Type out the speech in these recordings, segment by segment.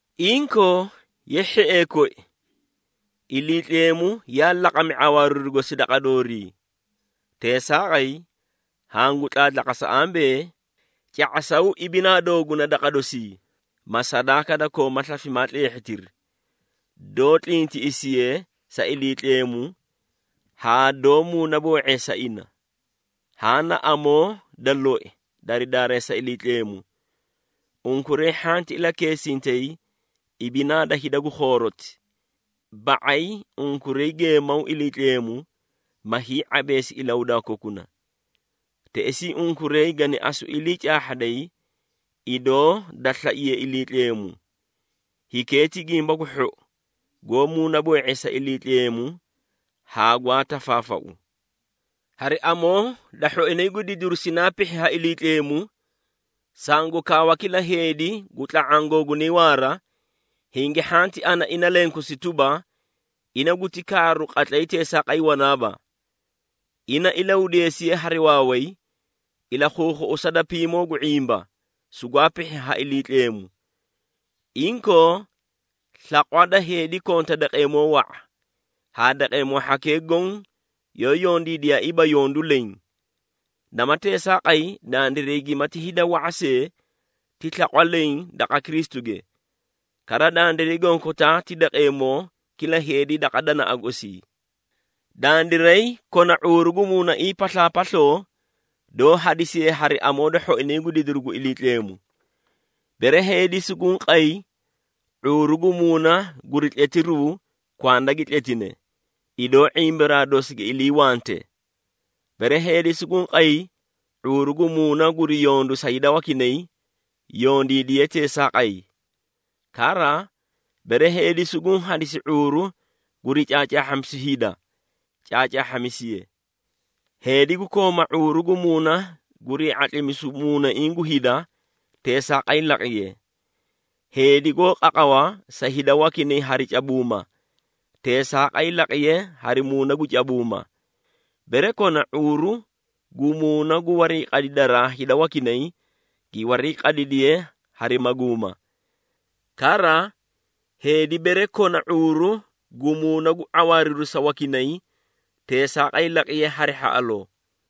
Inkoo, ye hhiee koi, Iliitleemu yaa laqami ⁄awaariru gosi daqa doorii. Teesaaqay, hangu tlaatlaqasa ambee, ca⁄asaw ibinaa dooguna daqa dosii, ma sadaaka da koomaa slafimaa tleehhitiri, doó tlintiꞌisiye sa Iliitleemu haa doó muunaboo⁄eesa ina. Haã na amoo da loi dari daareesa Iliitleemu. Unkuray hhanti ilakeesintay ibinaa da hida gu khooroti, ba⁄ay unkuray geemaw Iliitleemu, ma hii⁄abeesi ilahudaa kokuna. Teꞌesii unkuray gani asu ilii caahhaday idoo da slaiye Iliitleemu. Hikee ti gimba gu hhou, goó muunaboo⁄eesa Iliitleemu haa gwaa tafaafau. Hari amoo da hhoinay gu didiru sinaa pihhi ha Iliitleemu, sangu kaawa kila heedi gu tla⁄aã googunay waara, hingi hhanti ana ina lenkosi tuba, ina guti kaaru qatlay teesaaqay wanaaba. Ina ilahudeesiye hari waaway, ilakhuukhuꞌusa da piimoo gu ⁄imba sugwaa pihhi ha Iliitleemu. Inkoo, slaqwa da heedi konta daqeemoo wa⁄a, haa daqeemoo hhakee goõ yoó yondiidiyaaiiba yondu leẽ. Nama teesaaqay, dandiray gimati hida wa⁄a see, ti slaqwa leẽ daqa Kristuge. Kara, dandiray gonkotaa ti daqeemoo kila heedi daqa danaꞌa gosii. Dandiray kona ⁄uuru gu muunaiĩ paslaapasloo doó hadisiye hari amoo da hhoinay gu didiru gu Iliitleemu. Bere heedi suguũ qay ⁄uuru gu muuna guri tletiruu, kwanda gi tletine, idoo ⁄imbaraa dosi giyoó iliiwante. Bere heedi suguũ qay ⁄uuru gu muuna guri yondu sa hida wakinay, yondiidiye teesaaqay. Kara, bere heedi suguũ hadisi ⁄uuru guri caacaahhamisu hida, caacaahhamisiye. Heedi gu kooma ⁄uuru gu muuna gurii ⁄atlimisu muunaiĩ gu hida, teesaaqay laqiye. Heedi goó qaqawa sa hida wakinay hari cabuuma, teesaaqay laqiye hari muuna gu cabuuma. Bere kona ⁄uuru gu muuna gu warii qadidaraa hida wakinay, gi warii qadidiye hari maguuma. Kara, heedi bere kona ⁄uuru gu muuna gu ⁄awaariru sa wakinay, teesaaqay laqiye hari hhaꞌaloo.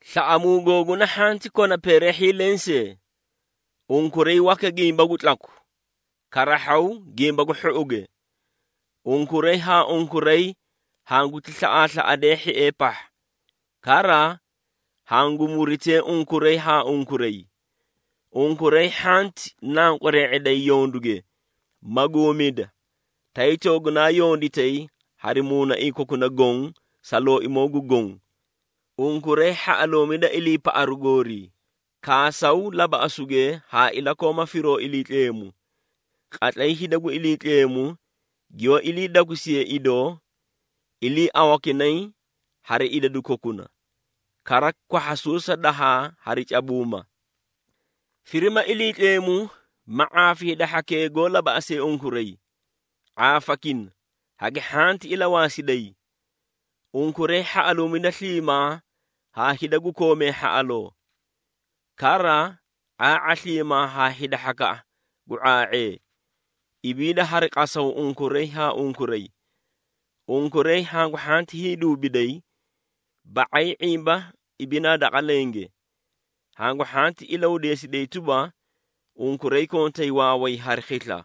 Slaꞌamuu googuna hhanti kona peereehhii lensee. Unkuray waka gimba gu tlaku, karahhaw gimba gu hhouge. Unkuray haa unkuray hanguti slaꞌaaslaꞌadee hhiee pahha. Kara, hangu muritee unkuray haa unkuray. Unkuray hhanti nanqwaree⁄eday yonduge, maguumida, tay toogunaa yonditay hari muunaiĩ kokuna goõ sa Looimoo gu Goõ. Unkuray hhaꞌaluumida iliipaꞌaru goorii, kaasaw labaꞌasuge haa ilakooma firoo Iliitleemu. Qatlay hida gu Iliitleemu giyoó ilii dakusiye idoo, iliiawakinay hari idadu kokuna. Kara, kwahhasuusa dahaa hari cabuuma. Firima Iliitleemu, ma ⁄aafi hida hhakee goó labaꞌasee unkuray. ⁄aafakina, hagi hhanti ilawaasiday. Unkuray hhaꞌaluumida sliimaa haa hida gu koomee hhaꞌaloo. Kara, ⁄aa⁄a sliimaa haa hida hhakaꞌa gu ⁄aa⁄ee. Ibiida hari qasaw unkuray haa unkuray. Unkuray hangu hhanti hiiduubiday, ba⁄ay ⁄imba ibinaa daqa lenge. Hangu hhanti ilahudeesiday tuba, unkuray kontay waaway hari khisla.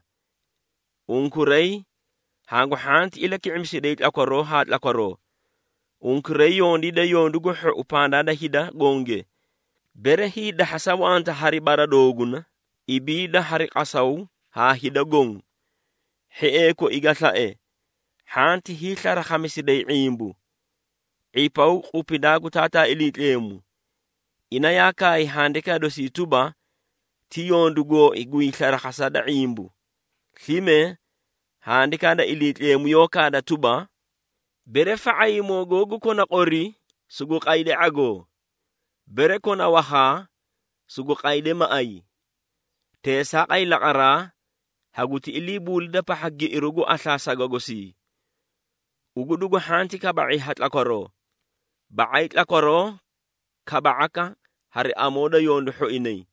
Unkuray hangu hhanti ilaki⁄imisiday tlakwaroo haa tlakwaroo. Unkuray yondiida yondu gu hhou pandaa da hida gonge. Bere hiidahhasa wanta hari bara dooguna, ibiida hari qasaw haa hida goõ. Hhiee koi ga slae, hhanti hiislarakhamisiday ⁄imbu. ⁄ipaw qupidaa gu Taataa Iliitleemu. Ina yaa kaay handikaa dosii tuba, “Ti yondu gooi gu hiislarakhasa da ⁄imbu.” Slime, Handikaa da Iliitleemu yoóti kaada tuba, “Bere fa⁄ayimoo googu kona qori, sugu qayde ⁄agoo, bere kona wakhaa, sugu qayde maꞌay. Teesaaqay laqaraa haguti iliibuulida pahha giꞌiru gu aslaa saga gosii.” Ugu dugu hhanti kaba⁄i ha tlakwaroo, ba⁄ay tlakwaroo kaba⁄aka hari amoo da yondu hhoinay.